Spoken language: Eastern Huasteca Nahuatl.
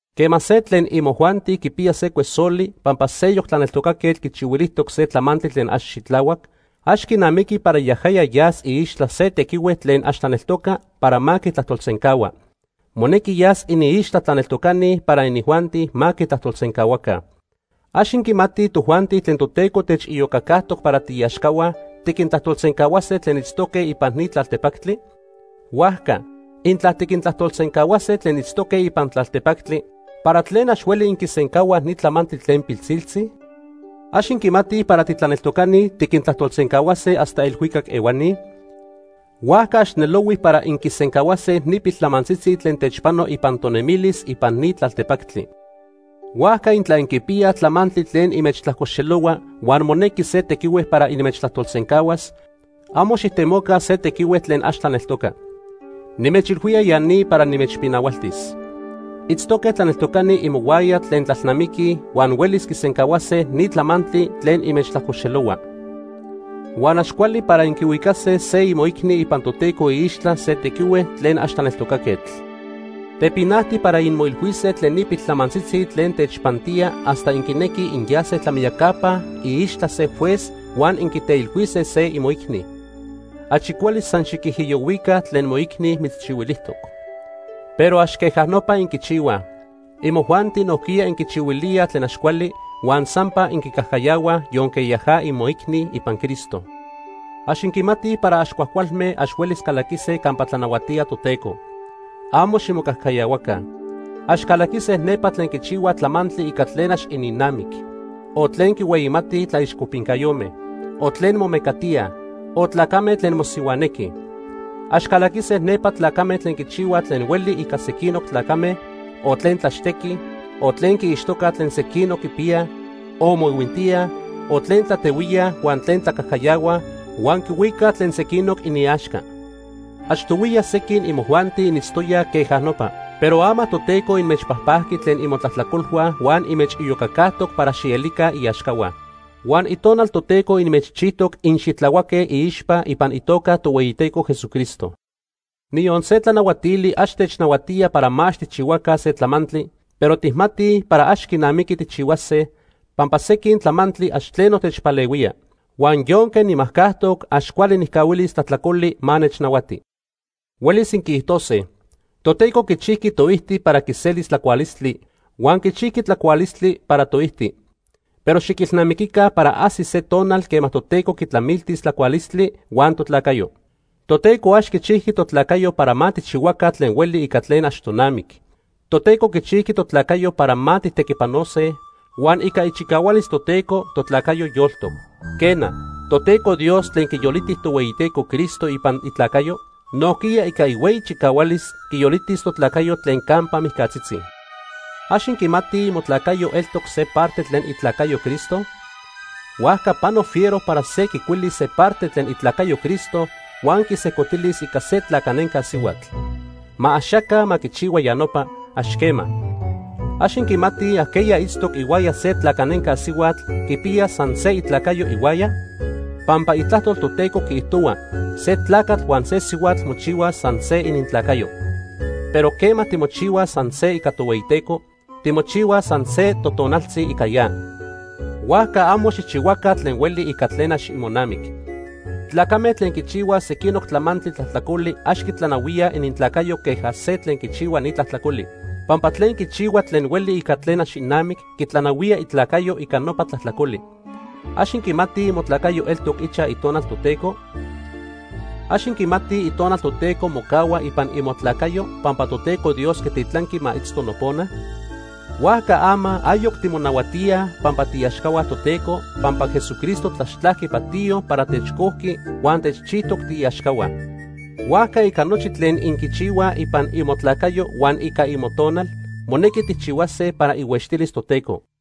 Quema se tlen imojuanti quipiya se cuesoli pampa seyoc tlaneltocaquetl quichihuilijtoc se tlamantli tlen ax xitlahuac, ax quinamiqui para yajaya yas iixtla se tequihue tlen ax tlaneltoca para ma quitlajtolsencahua. Monequi yas iniixtla tlaneltocani para inijuanti ma quitlajtolsencahuaca. ¿Ax inquimatij tojuanti tlen Toteco techiyocacajtoc para tiiaxcahua tiquintlajtolsencahuase tlen itztoque ipan ni tlaltepactli? Huajca, intla tiquintlajtolsencahuase tlen itztoque ipan tlaltepactli, ¿para tlen ax hueli inquisencahuaj ni tlamantli tlen pilsiltzi? ¿Ax inquimatij para titlaneltocani tiquintlajtolsencahuase hasta elhuicac ehuani? Huajca ax nelohui para inquisencahuase ni piltlamantzitzi tlen techpano ipan tonemilis ipan ni tlaltepactli. Huajca intla inquipiyaj tlamantli tlen inmechtlajcoxelohua huan monequi se tequihue para inmechtlajtolsencahuas, amo xijtemoca se tequihue tlen ax tlaneltoca. Nimechilhuía ya ni para nimechpinahualtis. Itztoque tlaneltocani imohuaya tlen tlalnamiquij huan huelis quisencahuase ni tlamantli tlen inmechtlajcoxelohua. Huan ax cuali para inquihuicase se imoicni ipan Toteco iixtla se tequihue tlen ax tlaneltocaquetl. Tepinajti para inmoilhuise tlen ni piltlamantzitzi tlen techpantía hasta inquinequij inyase tlamiyacapa iixtla se juez huan inquiteilhuise se imoicni. Achi cuali san xiquijiyohuica tlen moicni mitzchihuilijtoc. Pero ax queja nopa inquichihuaj. Imojuanti nojquiya inquichihuilíaj tlen ax cuali, huan sampa inquicajcayahuaj yonque yaja imoicni ipan Cristo. Ax inquimatij para ax cuajcualme ax huelis calaquise campa tlanahuatía Toteco. ¡Amo ximocajcayahuaca! Ax calaquise nepa tlen quichihuaj tlamantli ica tlen ax ininnamic, o tlen quinhueyimatij tlaixcopincayome, o tlen momecatíaj, o tlacame tlen mosihuanequij. Ax calaquise nepa tlacame tlen quichihuaj tlen hueli ica sequinoc tlacame, o tlen tlaxtequij, o tlen quiixtocaj tlen sequinoc quipiyaj, o moihuintíaj, o tlen tlatehuíaj huan tlen tlacajcayahuaj huan quihuicaj tlen sequinoc iniaxca. Achtohuiya sequin imojuanti initztoyaj queja nopa, pero ama Toteco inmechpajpajqui tlen imotlajtlacolhua huan inmechiyocacajtoc para xielica iaxcahua. Huan Itonal Toteco inmechchijtoc inxitlahuaque iixpa ipan itoca Tohueyiteco Jesucristo. Niyon se tlanahuatili ax technahuatía para ma ax tijchihuaca se tlamantli, pero tijmatij para ax quinamiqui tijchihuase, pampa sequin tlamantli ax tleno techpalehuía. Huan yonque nimajcajtoc, ax cuali nijcahuilis tlajtlacoli ma nechnahuati. Huelis inquiijtose: “Toteco quichijqui toijti para quiselis tlacualistli huan quichijqui tlacualistli para toijti”, pero xiquilnamiquica para ajsis se tonal quema Toteco quitlamiltis tlacualistli huan totlacayo. Toteco ax quichijqui totlacayo para ma tijchihuaca tlen hueli ica tlen ax tonamic. Toteco quichijqui totlacayo para ma tijtequipanose, huan ica ichicahualis Toteco totlacayo yoltoc. Quena, Toteco Dios tlen quiyoliti Tohueyiteco Cristo ipan itlacayo, nojquiya ica ihueyi chicahualis quiyolitis totlacayo tlen campa mijcatzitzi. ¿Ax inquimatij imotlacayo eltoc se parte tlen itlacayo Cristo? Huajca pano fiero para se quicuilis se parte tlen itlacayo Cristo huan quisejcotilis ica se tlacanenca sihuatl. Ma axaca ma quichihua ya nopa, ax quema. ¿Ax inquimatij ajqueya itztoc ihuaya se tlacanenca sihuatl quipiya san se itlacayo ihuaya? Pampa Itlajtol Toteco quiijtohua se tlacatl huan se sihuatl mochihuaj san se inintlacayo. Pero quema timochihuaj san se ica Tohueyiteco, timochihuaj san se totonaltzi ica ya. Huajca amo xijchihuaca tlen hueli ica tlen ax imonamic. Tlacame tlen quichihuaj sequinoc tlamantli tlajtlacoli ax quitlanahuíaj inintlacayo queja se tlen quichihua ni tlajtlacoli. Pampa tlen quichihua tlen hueli ica tlen ax inamic quitlanahuía itlacayo ica nopa tlajtlacoli. ¿Ax inquimatij imotlacayo eltoc ichaj Itonal Toteco? ¿Ax inquimatij Itonal Toteco mocahua ipan imotlacayo pampa Toteco Dios quititlanqui ma itzto nopona? Huajca ama ayoc timonahuatíaj pampa tiiaxcahua Toteco, pampa Jesucristo tlaxtlajqui patiyo para techcojqui huan techchijtoc tiiaxcahua. Huajca ica nochi tlen inquichihuaj ipan imotlacayo huan ica imotonal, monequi tijchihuase para ihuextilis Toteco.